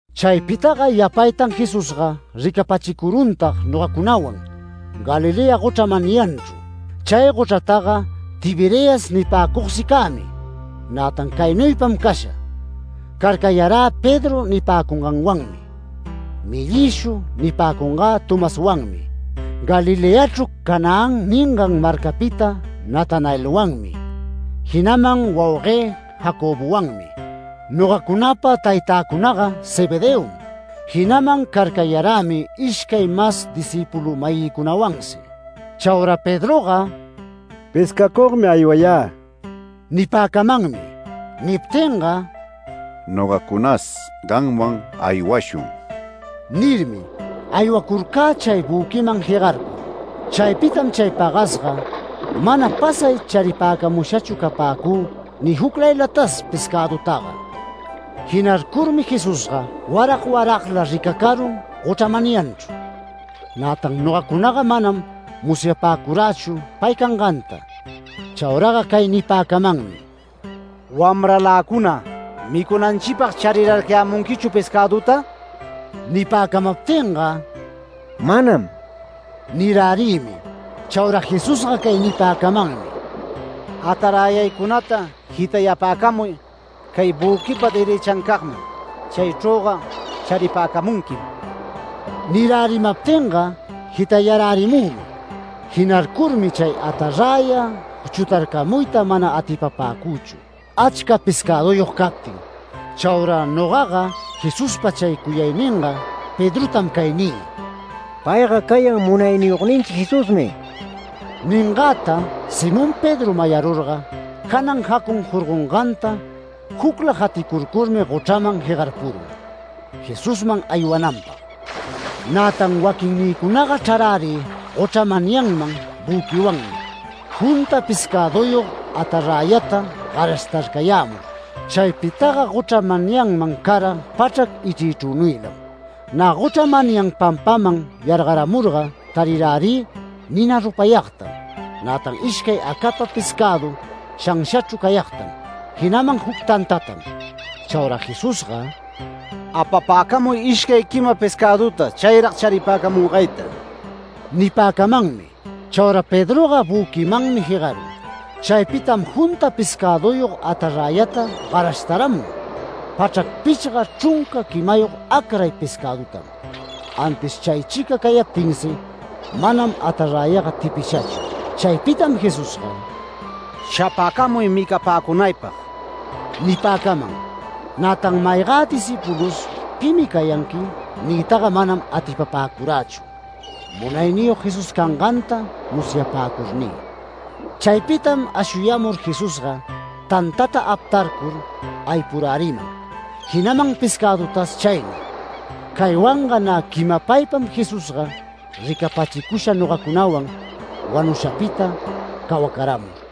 Chaypitaga yapaytan Jesusga ricapachicuruntag nogacunawan, Galilea gochra manyanchru. Chay gochrataga Tiberias nipäcugsi cämi, nätan caynuypam casha: Carcayarä Pedro nipäcunganwanmi, ‘Mellïshu’ nipäcunagä Tomaswanmi, Galileachru Canaán ningan marcapita Natanaelwanmi, jinaman wauguë Jacobowanmi. Nogacunapa taytäcunaga Zebedeom, jinaman carcayarämi ishcay mas discïpulu-mayïcunawansi. Chaura Pedroga “Pescacugmi aywayä” nipäcamanmi. Niptinga “Nogacunas gamwan aywashun” nirmi, aywacurcä chay büquiman jegarcur. Chaypitam chay pagasga mana pasay charipäcamushachu capäcü ni juclaylatas pescädutaga. Jinarcurmi Jesusga warag waragla ricacarun gochra manyanchru. Nätan nogacunaga manam musyapäcurächu pay canganta. Chauraga cay nipäcamanmi: “Wamraläcuna, ¿micunanchipag charirarcayämunquichu pescäduta?” Nipäcamaptinga “Manam” nirärïmi. Chaura Jesusga cay nipäcamanmi: “Ataräyaycunata jitayapäcamuy cay büquipa derëchancagman. Chaychrüga charipäcamunquim”. Nirärimaptinga jitayarärimümi. Jinarcurmi chay ataräya chutarcamuyta mana atipapäcüchu, achca pescäduyog captin. Chaura nogaga Jesuspa chay cuyayninga, Pedrotam cay nï: “¡Payga cayan Munayniyogninchi Jesusmi!” Ningäta Simón Pedro mayarurga janan jacun jorgonganta jucla jaticurcurmi gochraman jegarpurun, Jesusman aywananpag. Nätan waquinnïcunaga chrarärï gochra manyanman büquiwanmi, junta pescäduyog ataräyata garashtarcayämur. Chaypitaga gochra manyanman cara pachrac ichriychrünuylam. Nä gochra manyan pampaman yargaramurga tarirärï nina rupayagtam, nätan ishcay acapa pescädu shanshachru cayagtam, jinaman juc tantatam. Chaura Jesusga “Apapäcamuy ishcay quima pescäduta chayrag charipäcamungayta” nipäcamanmi. Chaura Pedroga büquimanmi jegarun. Chaypitam junta pescäduyog ataräyata garashtaramun, pachrac pichga chrunca quimayog acray pescädutam. Antis chaychica cayaptinsi manam ataräyaga tipishachu. Chaypitam Jesusga “Shapäcamuy micapäcunaypag” nipäcaman. Nätan maygä discïpulus “¿Pimi cayanqui?” niytaga manam atipapäcurächu, Munayniyog Jesús canganta musyapäcurnï. Chaypitam ashuyamur Jesusga, tantata aptarcur aypuräriman, jinaman pescädutas chaynuy. Caywanga nä quimapaypam Jesusga ricapachicusha nogacunawan, wanushapita cawacaramur.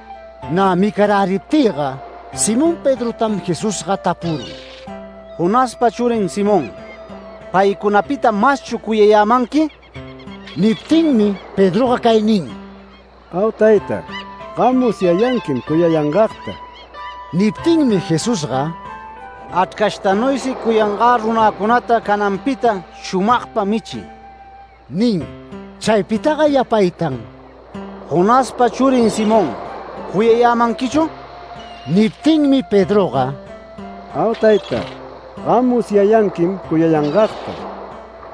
Nä micaräriptïga Simón Pedrotam Jesusga tapurun: “Jonaspa churin Simón, ¿paycunapita maschu cuyayämanqui?” Niptinmi Pedroga cay nin: “Au tayta. Gam musyayanquim cuyayangagta”. Niptinmi Jesusga “Achrcashtanuysi cuyangä runäcunata, cananpita shumagpa michiy” nin. Chaypitaga yapaytan: “Jonaspa churin Simón, ¿cuyayämanquichu?” Niptinmi Pedroga “Au tayta. Gam musyayanquim cuyayangagta”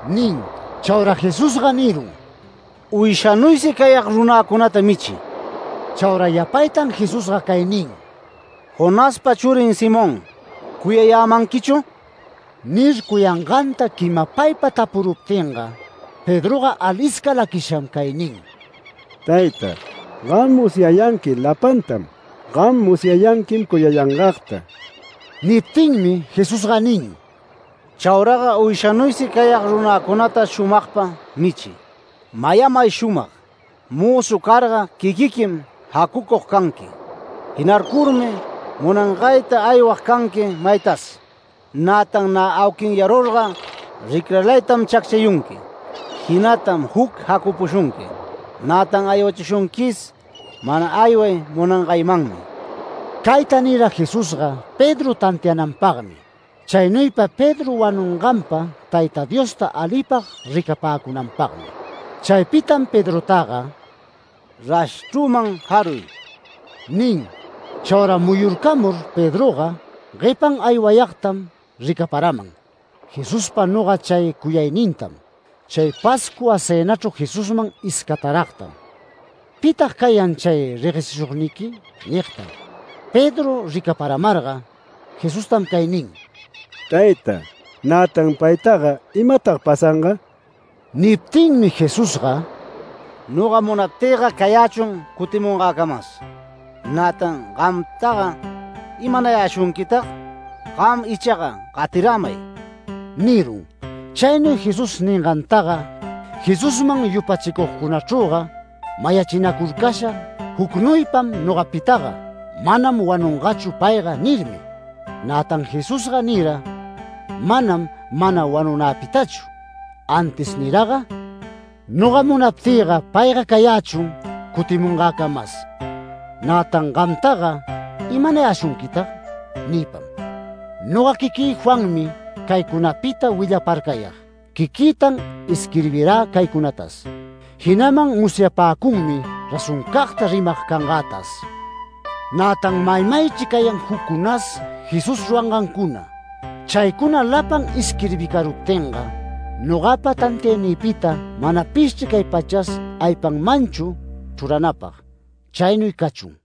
nin. Chaura Jesusga nirun: “Uyshanuysi cayag runäcunata michiy”. Chaura yapaytan Jesusga cay nin: “Jonaspa churin Simón, ¿cuyayämanquichu?” Nir cuyanganta quimapaypa tapuruptinga Pedroga alisca laquisham cay nin: “Tayta, gam musyayanqui lapantam. Gam musyayanquim cuyayangagta”. Niptinmi Jesusga nin: “Chauraga uyshanuysi cayag runäcunata shumagpa michiy. Mayamay shumag: Mözu carga quiquiquim jacucug canqui. Jinarcurmi munangayta aywag canqui maytas. Nätan nä auquinyarurga ricralaytam chacchayunqui, jinatam juc jacapushunqui. Nätan aywachishunquis mana ayway munangaymanmi”. Cayta nira Jesusga Pedro tantiananpagmi, chaynuypa Pedro wanunganpa Tayta Diosta alipag ricapäcunanpagmi. Chaypitam Pedrotaga “Rashchrüman jaruy” nin. Chaura muyurcamur Pedroga, guepan aywayagtam ricaparaman, Jesuspa noga chay cuyaynintam, chay Pascua cënachru Jesusman iscataragtam “¿Pitag cayan chay reguechishugniqui?” nigtam. Pedro ricaparamarga Jesustam cay nin: “Tayta, nätan paytaga ¿imatag pasanga?” Niptinmi Jesusga “Noga munaptïga cayächun cutimungäcamas. Nätan gamtaga ¿imanayäshunquitag? Gam ichaga gatiramay” nirun. Chaynuy Jesús ningantaga, Jesusman yupachicugcunachrüga mayachinacurcasha jucnuypam nogapitaga “Manam wanungachu payga” nirmi. Nätan Jesusga nira manam “Mana wanunäpitachu” antis niraga “Noga munaptïga payga cayächun cutimungäcamas. Nätan ¿gamtaga imanayäshunquitag?” niypam. Noga quiquï Juanmi caycunapita willaparcayag. Quiquïtan isquirbirä caycunatas. Jinaman musyapäcunmi razoncagta rimag cangätas. Nätan maymaychri cayan juccunas Jesús rurangancuna. Chaycuna lapan isquirbicaruptinga nogapa tantiaynïpita manapishchri cay pachas aypanmanchu chruranapag. Chaynuy cachun.